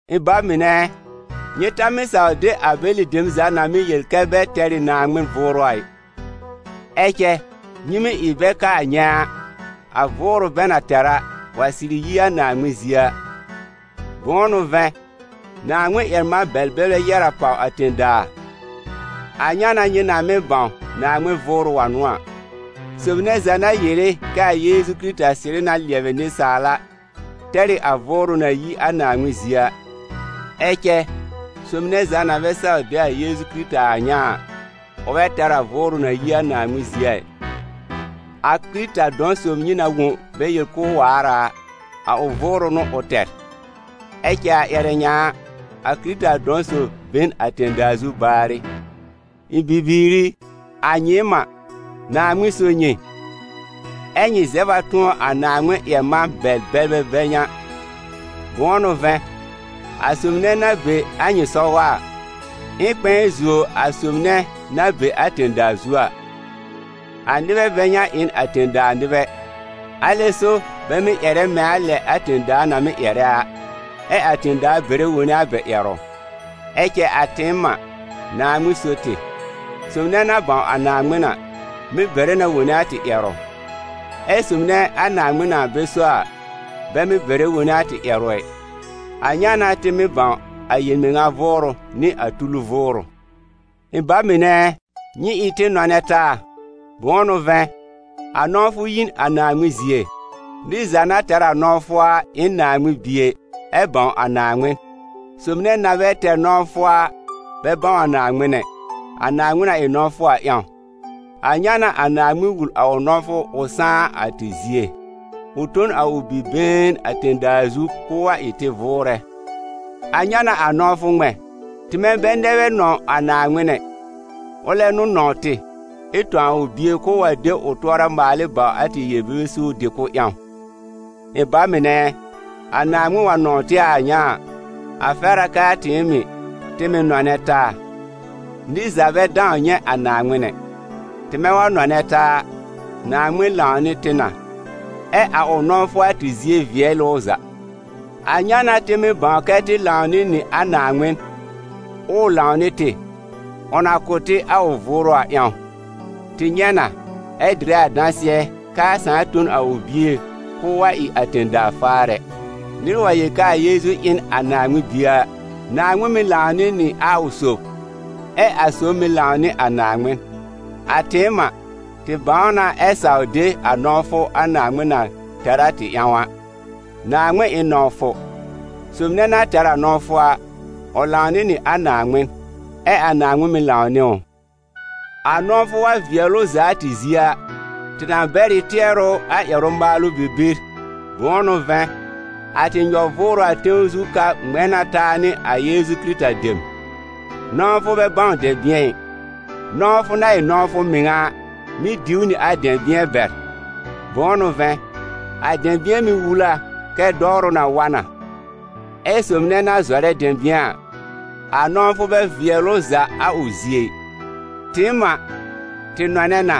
Ɩ̃ ba mɩnɛ ɛ, nyɩ ta mɩ́saw de a bɛlɩ dem za na mɩ́ yel kɛ bɛ tɛr ɩ Naaŋmɩn Vʋʋrʋ a ɩ. Ɛ cɛ, nyɩ mɩ́ ɩ bɛ kaa nyɛ̃ a vʋʋrʋ bɛ na tɛr a, wa sɩrɩ yi a Naaŋmɩn zie a. Bʋ̃ʋ n'ʋ vɛ̃, Naaŋmɩn-ƴɛr-man-bɛl-bɛlbɛ yɛ́r a pàw a tẽ-daa. A ŋa n'a nyɩ na mɩ́ bãw Naaŋmɩn Vʋʋrʋ wa n'ʋ a: sob nɛ za na yere kɛ a Yeezu Kɩrɩta sɩrɩ na lɩɛbɩ nɩsaal a, tɛr ɩ a Vʋʋrʋ na yi a Naaŋmɩn zie a. Ɛ cɛ sob nɛ za na bɛ saw de a Yeezu Kɩrɩta a a ŋa a, ʋ bɛ tɛr a Vʋʋrʋ na yi a Naaŋmɩn zie a ɩ, a Kɩrɩta dɔ̃ sob nyɩ na wõ bɛ yel k'ʋʋ waar a, a ʋ vʋʋrʋ n'ʋ ʋ tɛr. Ɛ cɛ a ƴɛrɛ ŋa a, a Kɩrɩta dɔ̃ sob be n a tẽ-daa zu baarɩ. Ɩ̃ bibiir i, a nyɩɩm a, Naaŋmɩn so nyɩ, ɛ́ nyɩ zɛb a tʋ̃ɔ a Naaŋmɩn-ƴɛr-man-bɛl-bɛlbɛ bɛ ŋa; bʋ̃ʋ n'ʋ vɛ̃, a sob nɛ na be a nyɩ sɔgɔ a, ɩ n kpɛ̃ɛ zuo a sob nɛ na be a tẽ-daa zu a. A nɩbɛ bɛ ŋa ɩ n a tẽ-daa nɩbɛ, alɛ so bɛ mɩ́ ƴɛrɛ mɛ̃ a lɛ a tẽ-daa na mɩ́ ƴɛrɛ a, ɛ a tẽ-daa bɛrɛ wone a bɛ ƴɛrʋ. Ɛ cɛ a tɩɩm a, Naaŋmɩn so tɩ. Sob nɛ na bãw a Naaŋmɩn a, mɩ́ bɛrɛ na wone a tɩ ƴɛrʋ. Ɛ sob nɛ a Naaŋmɩn na bɛ so a, bɛ mɩ́ bɛrɛ wone a tɩ ƴɛrʋ ɛ. A ŋa n'a tɩ mɩ́ bãw a yel-mɩŋa Vʋʋrʋ nɩ a tulu vʋʋrʋ. Ɩ̃ ba mɩnɛ ɛ, nyɩ ɩ tɩ nɔnɛ taa, bʋ̃ʋ n'ʋ vɛ̃, a nɔ̃wfʋ yi n a Naaŋmɩn zie. Nɩr za na tɛr a nɔ̃wfʋ a ɩ n Naaŋmɩn bie, ɛ bãw a Naaŋmɩn. Sob nɛ na bɛ tɛr nɔ̃wfʋ a, bɛ bãw a Naaŋmɩn ɛ, a Naaŋmɩn na ɩ nɔ̃wfʋ a ƴãw. A ŋa n'a a Naaŋmɩn wul a ʋ nɔ̃wfʋ ʋ sãá a tɩ zie: ʋ tõ n a ʋ Bi-been a tẽ-daa zu k'ʋʋ wa ɩ tɩ vʋʋrɛ. A ŋa n'a a nɔ̃wfʋ ŋmɛ̃: tɩmɛ bɛ nɛ bɛ nɔ̃w a Naaŋmɩn ɛ, ʋlɛ n'ʋ nɔ̃w tɩ, ɛ tõ a ʋ Bie k'ʋʋ wa de ʋ tʋɔra maal ɩ bawr a tɩ yel-bebe suur dɩ-kʋ̀b ƴãw. Ɩ̃ ba mɩnɛ ɛ, a Naaŋmɩn wa nɔ̃w tɩ a ŋa a, a fɛr a k'aa tɩɩm mɩ̀, tɩ mɩ̀ nɔnɛ taa. Nɩr za bɛ dãw nyɛ̃ a Naaŋmɩn ɛ. Tɩmɛ wa nɔnɛ taa a, Naaŋmɩn lãwnɩ tɩ na, ɛ a ʋ nɔ̃wfʋ a tɩ zie vɩɛl ɩ ʋ za. A ŋa n'a tɩ mɩ́ bãw kɛ tɩ lãw nɩ nɩ a Naaŋmɩn, ʋʋ lãw nɩ tɩ: ʋ na kʋ̀ tɩ a ʋ Vʋʋrʋ a ƴãw. Tɩ nyɛ̃ na, ɛ dɩrɛ a dãsɩɛ k'aa Sãà tõ n a ʋ Bie k'ʋʋ wa ɩ a tẽ-daa faarɛ. Nɩr wa yel k'aa Yeezu ɩ n a Naaŋmɩn Bie a, Naaŋmɩn mɩ́ lãwnɩ nɩ a ʋ sob, ɛ a sob mɩ̀ lãw nɩ a Naaŋmɩn. A tɩɩm a, tɩ bãw na ɛ saw de a nɔ̃wfʋ a Naaŋmɩn na tɛr a tɩ ƴãw a. Naaŋmɩn ɩ n nɔ̃wfʋ. Sob nɛ na tɛr a nɔ̃wfʋ a, ʋ lãwnɩ nɩ a Naaŋmɩn, ɛ a Naaŋmɩn mɩ̀ lãw nɩ ʋ. A nɔ̃wfʋ wa vɩɛl ʋ za a tɩ zie a, tɩ na bɛr ɩ tɩɛrʋ a ƴɛrʋ maalʋ bibir, bʋ̃ʋ n'ʋ vɛ̃, a tɩ nyɔ-v ʋʋrʋ a tẽw zu ka ŋmɛ̃ na taa nɩ a Yeezu Kɩrɩta dem. N ɔ̃wfʋ bɛ bãw dɛ̃bɩ̃ɛ ɩ. Nɔ̃wfʋ na ɩ nɔ̃wfʋ mɩŋa a, mɩ́ diw nɩ a dɛ̃bɩ̃ɛ bɛr. Bʋ̃ʋ n'ʋ vɛ̃, a dɛ̃bɩ̃ɛ mɩ́ wul a kɛ dɔwrʋ na wa na. Ɛ sob nɛ na zɔrɛ dɛ̃bɩ̃ɛ a, a nɔ̃wfʋ bɛ vɩɛl ʋ za a ʋ zie ɩ. Tɩɩm a, tɩ nɔnɛ na,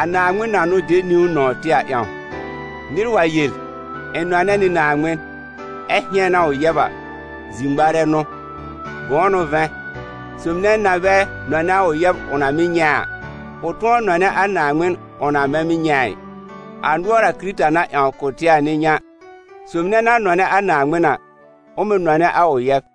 a Naaŋmɩn na n'ʋ de niwn nɔ̃w tɩ a ƴãw. Nɩr wa yel: «Ɩ̃ nɔnɛ nɩ Naaŋmɩn», ɛ hɩ̃ɛn a ʋ yɛb a, zir-ŋmarɛ n'ʋ. Bʋ̃ʋ n'ʋ vɛ̃, sob nɛ na bɛ nɔnɛ a ʋ yɛb ʋ na mɩ́ nyɛ̃ a, kʋ̃ tʋ̃ɔ nɔnɛ a Naaŋmɩn ʋ na bɛ mɩ́ nyɛ̃ a ɩ. A nʋɔr a Kɩrɩta na ƴãw kʋ̀ tɩ a n'ɩ ŋa: sob nɛ na nɔnɛ a Naaŋmɩn a, ʋ mɩ̀ nɔnɛ a ʋ yɛb.